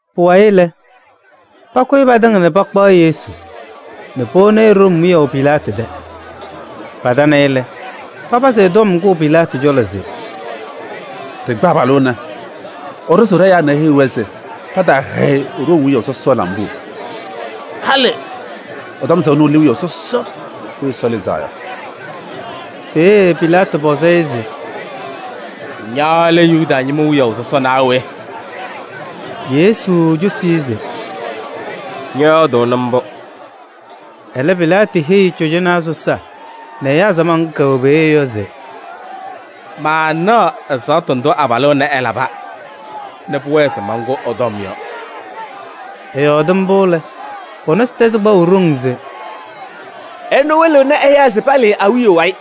Pʋwayɩ lɛ, pakʋyɩ patɩŋa nɛ pakpaɣ Yesu nɛ powoni-i Room wiyaʋ Pilaatɩ tɛ. Patana-ɩ lɛ, papazɩ ɛ-tɔm kʋʋ Pilaatɩ cɔlɔ se: “Ɖɩkpa abalʋ ɛnɛ, ɛɖʋzʋʋ ɖɛ-ɛyaa nɛ eheyiɣ-wɛ se pataahɛyɩ Room wiyaʋ sɔsɔ lambuu. Halɩ ɛtɔm se ɛnʋ lɛ wiyaʋ sɔsɔ Weyi Ɛsɔ Lɩzaa Yɔ.” Peeye Pilaatɩ pɔzɩ-ɩ se: “Ña lɛ Yuda ñɩma wiyaʋ sɔsɔ naa we?” Yesu cosi-i se: “Ñɔyɔɔdʋʋnɩ mbʋ.” Ɛlɛ Pilaatɩ heyi Cɔjɔnaa sɔsaa nɛ ɛyaa samaɣ ŋga kɛwɛ peeye yɔ se: “Maanaɣ ɛzaɣtʋ ndʋ abalʋ ɛnɛ ɛlaba nɛ pʋwɛɛ se mankʋ ɛ-tɔm yɔ.” Ɛyɔɔdɩ mbʋ lɛ, pɔ-nɔsɩ tɛzɩ kpaʋ ɖoŋ se: “Ɛnʋ wɩlɩɣnɩ ɛyaa se palɩɩ awiya wayɩ.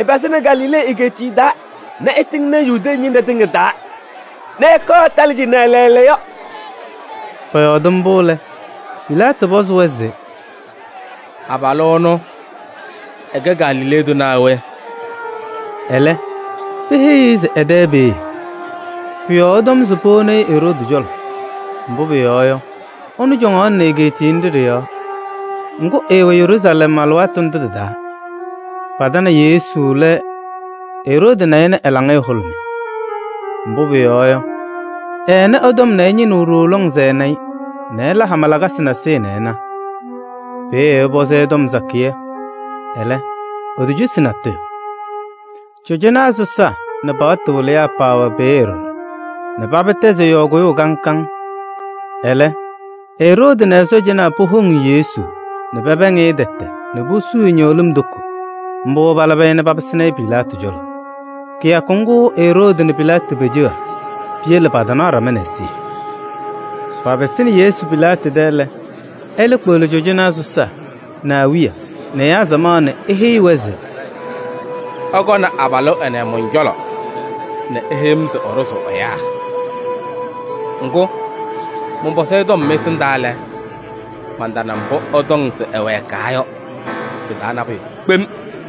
Ɛpazɩnɩ Galilee egeetiye taa nɛ ɛtɩŋnɩ Yudee ñɩnɖɛ tɩŋa taa nɛ ɛkɔɔ ɛtalɩ cɩnɛ lɛɛlɛɛyɔ.” Pɔyɔɔdɩ mbʋ lɛ, Pilaatɩ pɔzɩ-wɛ se: “Abalʋ ɛnʋ ɛkɛ Galilee tʋ naa we?” Ɛlɛ peheyi-i se ɛ-tɛ peeye. Pʋ-yɔɔ ɛtɔm se powoni-i Eroodi cɔlɔ, mbʋ pʋyɔɔ yɔ, ɛnʋ cɔŋaɣnɩnɩ egeetiye nɖɩ ɖɩ-yɔɔ. Ŋgʋ, ɛɛwɛ Yeruusalɛm alɩwaatʋ ndʋ tɩ-taa. Patanɩ Yesu lɛ Eroodi na-ɩ nɛ ɛ-laŋɩyɛ hʋlʋmɩ. Mbʋ pʋyɔɔ yɔ, ɛɛnɩ ɛ-tɔm nɛ ɛñɩnɩɣ ɖooo lɔŋ se ɛna-ɩ nɛ ɛla hama lakasɩ nasɩyɩ nɛ ɛna. Peeye ɛpɔzɩ-ɩ tɔm sakɩyɛ, ɛlɛ, etocosi-i natʋyʋ. Cɔjɔnaa sɔsaa nɛ paɣtʋ wɩlɩyaa paawɛ peeye ɖɔɖɔ nɛ paba tɛzɩ ɛ-yɔɔ kʋyʋʋ kaŋ kaŋ. Ɛlɛ Eroodi nɛ ɛ-sɔɔjanaa powoŋ Yesu nɛ pɛpɛɛŋ-ɩ tɛtɛ nɛ posuu-i ñɩɣlɩm toko. Mbʋ palabɩ-ɩ nɛ papɩsɩnɩ-ɩ Pilaatɩ cɔlɔ. Kɩyakʋ ŋgʋ Eroodi nɛ Pilaatɩ peceɣa. Piyele pataanaɣ ɖama nɛ ɛzɩyɛ. Papɩsɩnɩ Yesu Pilaatɩ tɛ lɛ, ɛlɛ kpeɣli cɔjɔnaa sɔsaa nɛ awiya nɛ ɛyaa samaɣ nɛ eheyi-wɛ se: “Ɩkɔnɩ abalʋ ɛnɛ mɔn-cɔlɔ nɛ iheyi-m se ɛɖʋzʋʋ ɛyaa. Ŋgʋ, mɔnpɔzɩ-ɩ tɔm mɩ-ɛsɩndaa lɛ, mantana mbʋ ɩtɔŋ se ɛwɛɛkaa yɔ pɩ-taa nabʋyʋ kpem.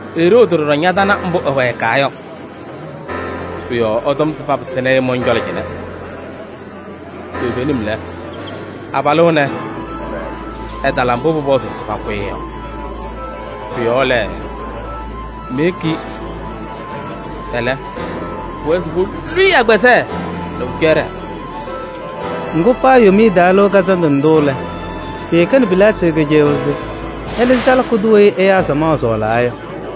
Eroodi ɖɔɖɔ ñatana mbʋ ɛwɛɛkaa yɔ. Pʋ-yɔɔ ɛtɔm se papɩsɩnɩ-ɩ mɔn-cɔlɔ cɩnɛ. Toovenim lɛ, abalʋ ɛnɛ, ɛtala mbʋ pʋpɔzʋʋ se pakʋ-ɩ yɔ. Pʋ-yɔɔ lɛ, meyeki-i. Ɛlɛ, pʋwɛɛ se polu-i agbazɛɛ nɛ pʋcɔ ɛɖɛɛ.” [ Ŋgʋ, paa Yomiye Taa Lɩʋ Kazandʋ ndʋ lɛ, pɩɩkɛnɩ Pilaatɩ kɩcɛyʋʋ se ɛlɩzɩ salaka tʋ weyi ɛyaa samaɣ sɔɔlaa yɔ.]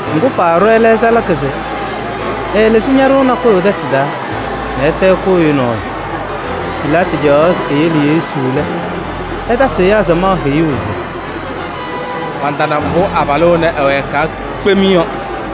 Ŋgʋ, paaɖʋ ɛlɛ salaka se ɛlɩzɩ ñaɖʋʋ nakʋyʋ tɛtʋ taa nɛ ɛtɛ ɛkʋ ɛyʋ nɔɔyʋ. Pilaatɩ caɣaɣ se eyele Yesu lɛ, ɛtasɩ ɛyaa samaɣ heyuu se: “Mantana mbʋ abalʋ ɛnɛ ɛwɛɛkaa kpem yɔ.”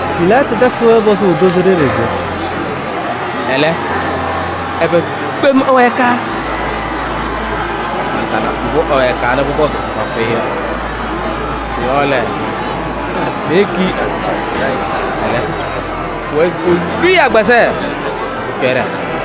Pilaatɩ tasɩ-wɛ pɔzʋʋ tozo ɖeɖe se: “Ɛlɛ, ɛbɛ kpem ɛwɛɛkaa? Mantana mbʋ ɛwɛɛkaa nɛ pʋpɔzʋʋ se pakʋ-ɩ yɔ. Pʋ-yɔɔ lɛ, meyeki-i. Ɛlɛ, pʋwɛɛ se polu-i agbazɛɛ nɛ pʋcɔ ɛɖɛɛ.”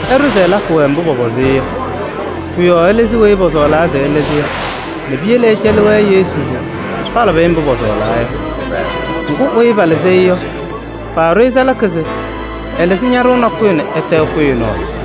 ɛɖʋ se ɛlakɩ-wɛ mbʋ pɔpɔzɩ-ɩ yɔ. Pʋ-yɔɔ ɛlɩzɩ weyi pɔsɔɔlaa se ɛlɩzɩ yɔ nɛ piyele ɛcɛlɩ-wɛ Yesu se palabɩ-ɩ mbʋ pɔsɔɔlaa yɔ. Ŋgʋ, weyi ɛlɩzɩ-ɩ mbʋ yɔ, paaɖʋ-ɩ salaka se ɛlɩzɩ ñaɖʋʋ nakʋyʋ nɛ ɛtɛ ɛkʋ ɛyʋ nɔɔyʋ.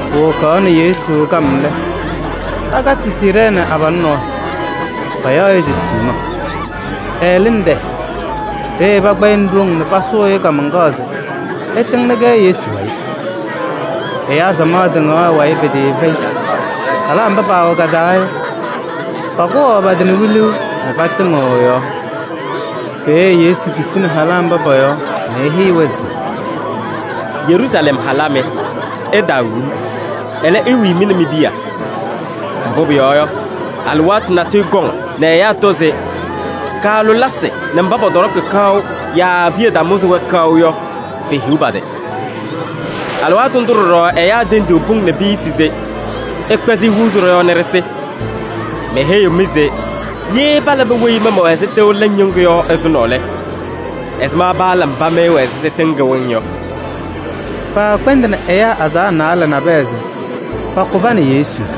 Powokaɣnɩ Yesu kam lɛ, pakatɩ Siirɛɛnɩ abalʋ nɔɔyʋ, payaɣ-ɩ se Siimɔɔ. Ɛlɩnɩ tɛyɛ. Peeye pakpa-ɩ nɛ ɖoŋ nɛ pasʋʋ-ɩ kaamaŋkaɣ se ɛtɩŋnɩ-kɛ Yesu wayɩ. Ɛyaa samaɣ tɩŋaɣ ɛ-wayɩ pɩtɩɩfɛyɩ. Halaa mba paawɛ ka-taa yɔ, pakʋwaɣ pa-tɩ nɛ wiluu nɛ patɩmɩɣ ɛ-yɔɔ. Peeye Yesu kisini halaa mba pɔ-yɔɔ nɛ eheyi-wɛ se: “Yeruusalɛm halaa mɩ! Ɩtaawi-m, ɛlɛ, iwii mɩ nɛ mi-piya. Mbʋ pʋyɔɔ yɔ, alɩwaatʋ natʋyʋ kɔŋ nɛ ɛyaa tɔ se: ‘Kaalʋlɩsɩ nɛ mba pɔtɔɖɔkɩ kaʋ yaa piya tamʋzɩ-wɛ kaʋ yɔ, pehiɣ pa-tɩ!’ Alɩwaatʋ ndʋ ɖɔɖɔ ɛyaa tendiɣ pʋŋ nɛ piyisi se: ‘Ɩkpɛzɩ ihuuzi ɖɔ-yɔɔ nɛ ɖɩsɩ.’ Meheyiɣ-mɩ se ye palabɩ weyi ma mɛwɛ ɛzɩ tɩʋ lɛŋ ñɩŋgʋ yɔ ɛzʋnɔ lɛ, ɛzɩma paala mba mɩ ɩwɛ ɛzɩ tɩŋ kɩwɩŋ yɔ?” Paakpɛndɩnɩ ɛyaa azaɣa naalɛ nabɛyɛ se pakʋ pa nɛ Yesu.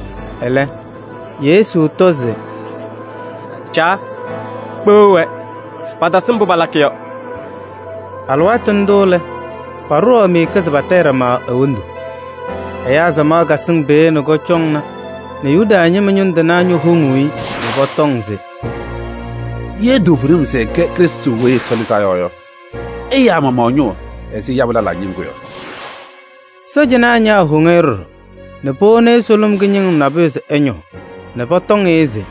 Ɛlɛ Yesu tɔ se: “Caa! Kpeɣ-wɛ, patasɩ mbʋ palakɩ yɔ.” Alɩwaatʋ ndʋ lɛ, paɖʋwaɣ miika se patayɩ ɖama e-wondu. Ɛyaa samaɣ kasɩŋ peeye nɛ kɔcɔŋna nɛ Yuda ñɩma ñʋŋ tɩnaa ñowoŋuu-i nɛ pɔtɔŋ se: “Ye toovenim se ɛkɛ Krɩstʋ Weyi Ɛsɔ Lɩzaa Yɔ yɔ, ɛya ɛ-maɣmaɣ ɛ-ñʋʋ ɛzɩ ɛyabʋ lɛlaa ñɩŋgʋ yɔ!” Sɔɔjanaa ñaawoŋ-i ɖɔɖɔ nɛ powoni-i sʋlʋm kɩñɩŋɩm nabʋyʋ se ɛñɔɔ nɛ pɔtɔŋ-ɩ se: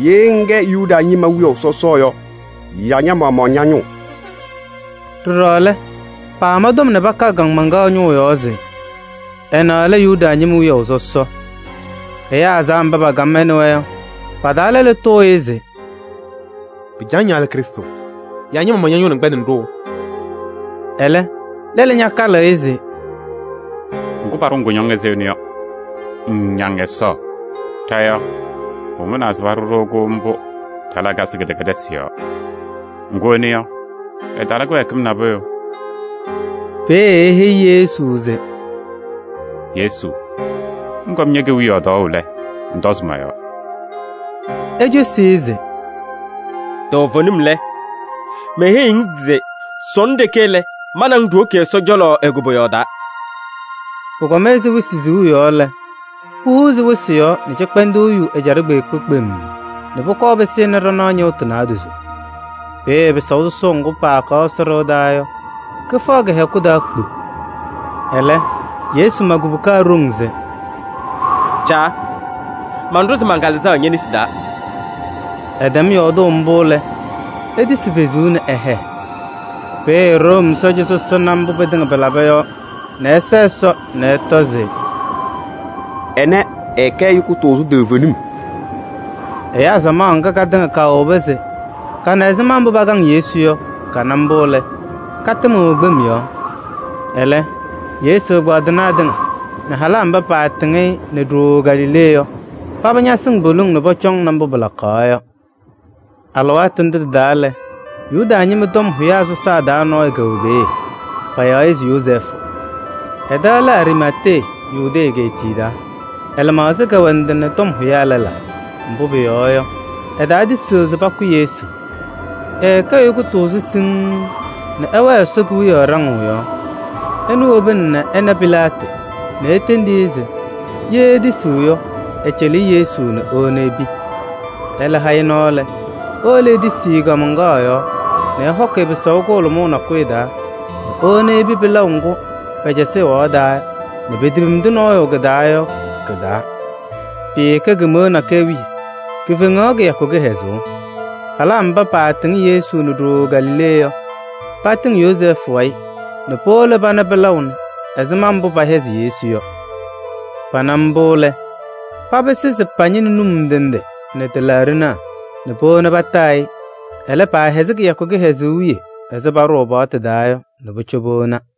“Ye ŋkɛ Yuda ñɩma wiyaʋ sɔsɔ yɔ, ya ña-maɣmaɣ ña-ñʋʋ!” Ɖɔɖɔ lɛ, paama tɔm nɛ paka ɛ-kaamaŋkaɣ ñʋʋ yɔɔ se: “Ɛnɛ lɛ Yuda ñɩma wiyaʋ sɔsɔ.” Ɛyaa azaɣa mba pakam ɛ nɛ wɛ yɔ, pa-taa lɛlʋ tʋʋ-ɩ se: “Pɩcaɣ ña lɛ Krɩstʋ? Ŋŋyakɩ ña-maɣmaɣ ña-ñʋʋ se ŋkpɛndɩnɩ-ɖʋ yɔ?” Ɛlɛ, lɛlʋ ñakalɩ-ɩ se: “Ŋgʋ, paɖʋ-ŋ kʋñɔŋ ɛzɩ ɛnʋ yɔ, ŋŋñaŋ Ɛsɔ?” Ɖa yɔ, pʋmʋnaa se paɖʋ-ɖʋ-kʋ mbʋ ɖa-lakasɩ kɩdɛkɛdɩsɩ yɔɔ. Ŋgʋ ɛnʋ yɔ, ɛtala kɩwɛɛkɩm nabʋyʋ. Peeye eheyi Yesu se: “Yesu! Ŋkɔm ñe-kewiyaɣ tɔɔʋ lɛ, ŋtɔzɩ mɔ-yɔɔ.” Ecosi-i se: “Toovenim lɛ, meheyiɣ-ŋ se sɔnɔ ɖeke lɛ, ma nɛ ŋ ɖiwoki Ɛsɔ cɔlɔ e-koboyaɣ taa.” Pʋkɔm ɛzɩ wɩsɩ siɣu yɔ lɛ, puhuuzi wɩsɩ yɔɔ nɛ cɩkpɛndʋʋ yu ɛjaɖɛ kpeekpe kpemm nɛ pʋkɔɔ pɩsɩnɩ ɖanaɣ ñɩɣtʋ naadozo. Peeye pɩsaʋ sɔsɔʋ ŋgʋ paakaɣ Ɛsɔ ɖɩɣa taa yɔ, kɩfaɣ kɩ-hɛkʋ taa kpu. Ɛlɛ Yesu ma kubuka ɖoŋ se: “Caa! Manɖʋzɩ man-Kalɩzaɣ ñe-nesi taa.” Ɛtɛm yɔɔdʋʋ mbʋ lɛ, etisi fezuu nɛ ɛhɛɛ. Peeye Room sɔɔja sɔsɔ na mbʋ pɩtɩŋa pɩlaba yɔ nɛ ɛsa Ɛsɔ nɛ ɛtɔ se: “Ɛnɛ, ɛɛkɛ ɛyʋ kʋtʋʋzʋ toovenim!” Ɛyaa samaɣ ŋga katɩŋa kaawobi se kana ɛzɩma mbʋ pakaŋ Yesu yɔ, kana mbʋ lɛ, katɩmɩɣ kpem yɔɔ. Ɛlɛ Yesu ɛgbaadɩnaa tɩŋa nɛ halaa mba patɩŋ-ɩ nɛ ɖooo Galilee yɔ, paba ñaasɩŋ poliŋ nɛ pɔcɔŋnɩ mbʋ pɩlakaɣ yɔ. Alɩwaatʋ ndʋ tɩ-taa lɛ, Yuda ñɩma tɔm hʋyaa sɔsaa taa nɔɔyʋ kɛwɛ peeye, payaɣ-ɩ se Yozɛɛfʋ. Ɛ-tɛ lɛ Ariimatee, Yudee egeetiye taa. Ɛ-lɩmaɣza kɛwɛ ndɩ nɛ tɔm hʋyaa lɛlaa. Mbʋ pʋyɔɔ yɔ, ɛtaatisiɣ se pakʋ Yesu. Ɛɛkɛ ɛyʋ kʋtʋʋzʋ siŋŋ nɛ ɛwɛɛ Ɛsɔ Kewiyaɣ ɖaŋʋʋ yɔɔ. Ɛnʋ wobini ɛna Pilaatɩ nɛ etendi-i se ye etisiɣ yɔ, ɛcɛlɩ-ɩ Yesu nɛ ewoni epi. Ɛlɛ ha-ɩ nɔɔ lɛ, ewolo etisi-i kaamaŋkaɣ yɔɔ nɛ ɛhɔkɩ-ɩ pɩsaʋ kʋhʋlʋmʋʋ nakʋyʋ taa nɛ ewoni-i epi pɩlaʋ ŋgʋ pɛcɛsɩ ɛwaɣ taa nɛ petepimdi nɔɔyʋ kɩ-taa yɔ kɩ-taa. Pɩɩkɛ kemeɣa nakɛyɛ wiye, kifeŋaɣ kɩyakʋ kɩhɛzʋʋ. Halaa mba paatɩŋ Yesu nɛ ɖooo Galilee yɔ, patɩŋ Yozɛɛfʋ nɛ powolo pana pɩlaʋ nɛ ɛzɩma mbʋ pɛhɛzɩ Yesu yɔ. Pana mbʋ lɛ, papɩsɩ se pañɩnɩ num ndɩ ndɩ nɛ tɩlaaɖɩnaa nɛ powoni pataa-ɩ. Ɛlɛ, paahɛzɩ kɩyakʋ kɩhɛzʋʋ wiye ɛzɩ paɖʋʋ paɣtʋ taa yɔ nɛ pʋcɔ powona.